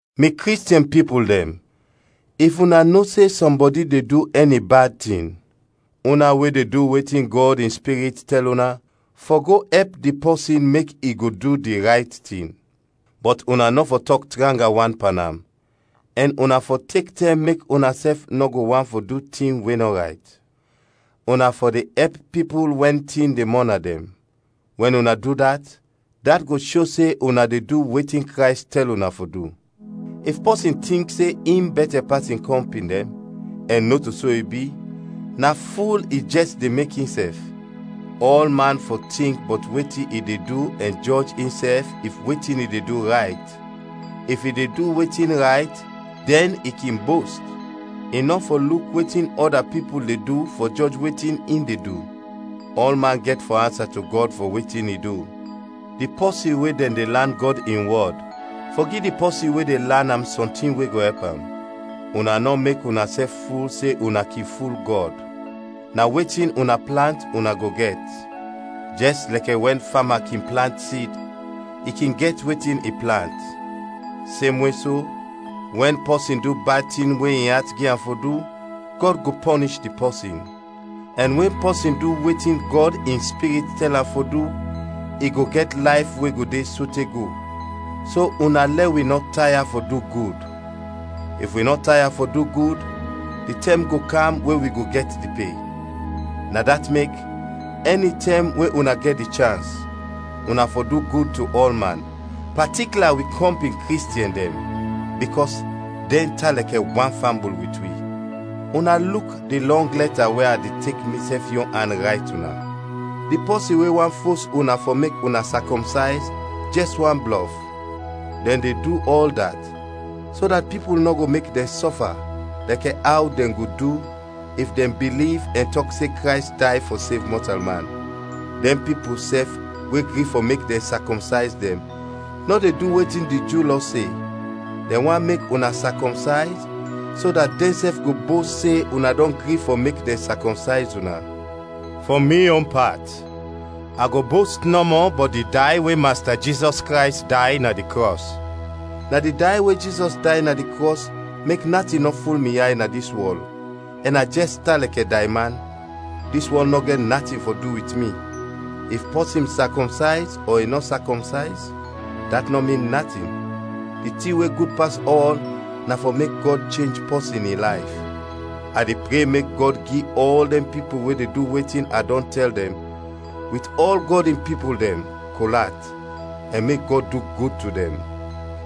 Mi Kristiɛn pipul dɛn, if una no se sɔmbɔdi de du ɛni bad tin, una we de du wetin Gɔd in Spirit tɛl una, fɔ go ɛp di pɔsin mek i go du di rayt tin. Bɔt una nɔ fɔ tɔk tranga wan pan am, ɛn una fɔ tek tɛm mek unasɛf nɔ go want fɔ du tin we nɔ rayt. Una fɔ de ɛp pipul wɛn tin de mɔna dɛn, wɛn una du dat, dat go sho se una de du wetin Krays tɛl una fɔ du. If pɔsin tink se in bɛtɛ pas in kɔmpin dɛn, ɛn nɔto so i bi, na ful i jɛs de mek insɛf. Ɔlman fɔ tink bɔt wetin i de du ɛn jɔj insɛf if wetin i de du rayt; if i de du wetin rayt, dɛn i kin bost. I nɔ fɔ luk wetin ɔda pipul de du fɔ jɔj wetin in de du. Ɔlman gɛt fɔ ansa to Gɔd fɔ wetin i du. Di pɔsin we dɛn de lan Gɔd in wɔd, fɔ gi di pɔsin we de lan am sɔntin we go ɛp am. Una nɔ mek unasɛf ful se una kin ful Gɔd. Na wetin una plant, una go gɛt. Jɛs lɛkɛ wɛn fama kin plant sid, i kin gɛt wetin i plant. Semwe so, wɛn pɔsin du bad tin we in at gi am fɔ du, Gɔd go pɔnish di pɔsin. Ɛn wɛn pɔsin du wetin Gɔd in Spirit tɛl am fɔ du, i go gɛt layf we go de sote go. So una lɛ wi nɔ taya fɔ du gud, if wi nɔ taya fɔ du gud, di tɛm go kam we wi go gɛt di pe. Na dat mek, ɛnitɛm we una gɛt di chans, una fɔ du gud to ɔlman, patikla wi kɔmpin Kristiɛn dɛn, bikɔs dɛn tan lɛkɛ wan fambul wit wi. Una luk di lɔng lɛta we a de tek misɛf yon an rayt una. Di pɔsin we want fos una fɔ mek una sakɔmsayz, jɛs want blɔf. Dɛn de du ɔl dat, so dat pipul nɔ go mek dɛn sɔfa, lɛkɛ aw dɛn go du, if dɛn biliv ɛn tɔk se Krays day fɔ sev mɔtalman. Dɛn pipul sɛf we gri fɔ mek dɛn sakɔmsayz dɛn nɔ de du wetin di Ju Lɔ se. Dɛn want mek una sakɔmsayz, so dat dɛnsɛf go bost se una dɔn gri fɔ mek dɛn sakɔmsayz una. Fɔ mi yon pat, a go bost nɔmɔ bɔt di day we Masta Jizɔs Krays day na di krɔs. Na di day we Jizɔs day na di krɔs mek natin nɔ ful mi yay na dis wɔl, ɛn a jɛs tan lɛkɛ dayman; dis wɔl nɔ gɛt natin fɔ du wit mi. If pɔsin sakɔmsayz ɔ i nɔ sakɔmsayz, dat nɔ min natin; di tin we gud pas ɔl na fɔ mek Gɔd chenj pɔsin in layf. A de pre mek Gɔd gi ɔl dɛn pipul we de du wetin a dɔn tɛl dɛn, wit ɔl Gɔd in pipul dɛn, kol at, ɛn mek Gɔd du gud to dɛn!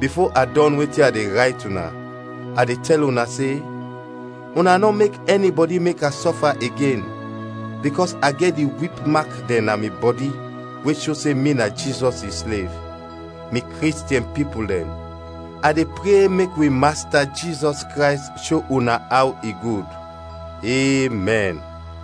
Bifo a dɔn wetin a de rayt una, a de tɛl una se: una nɔ mek ɛnibɔdi mek a sɔfa igen, bikɔs a gɛt di wip mak dɛn na mi bɔdi we sho se mi na Jizɔs in slev. Mi Kristiɛn pipul dɛn, a de pre mek wi Masta Jizɔs Krays sho una aw i gud. Emɛn.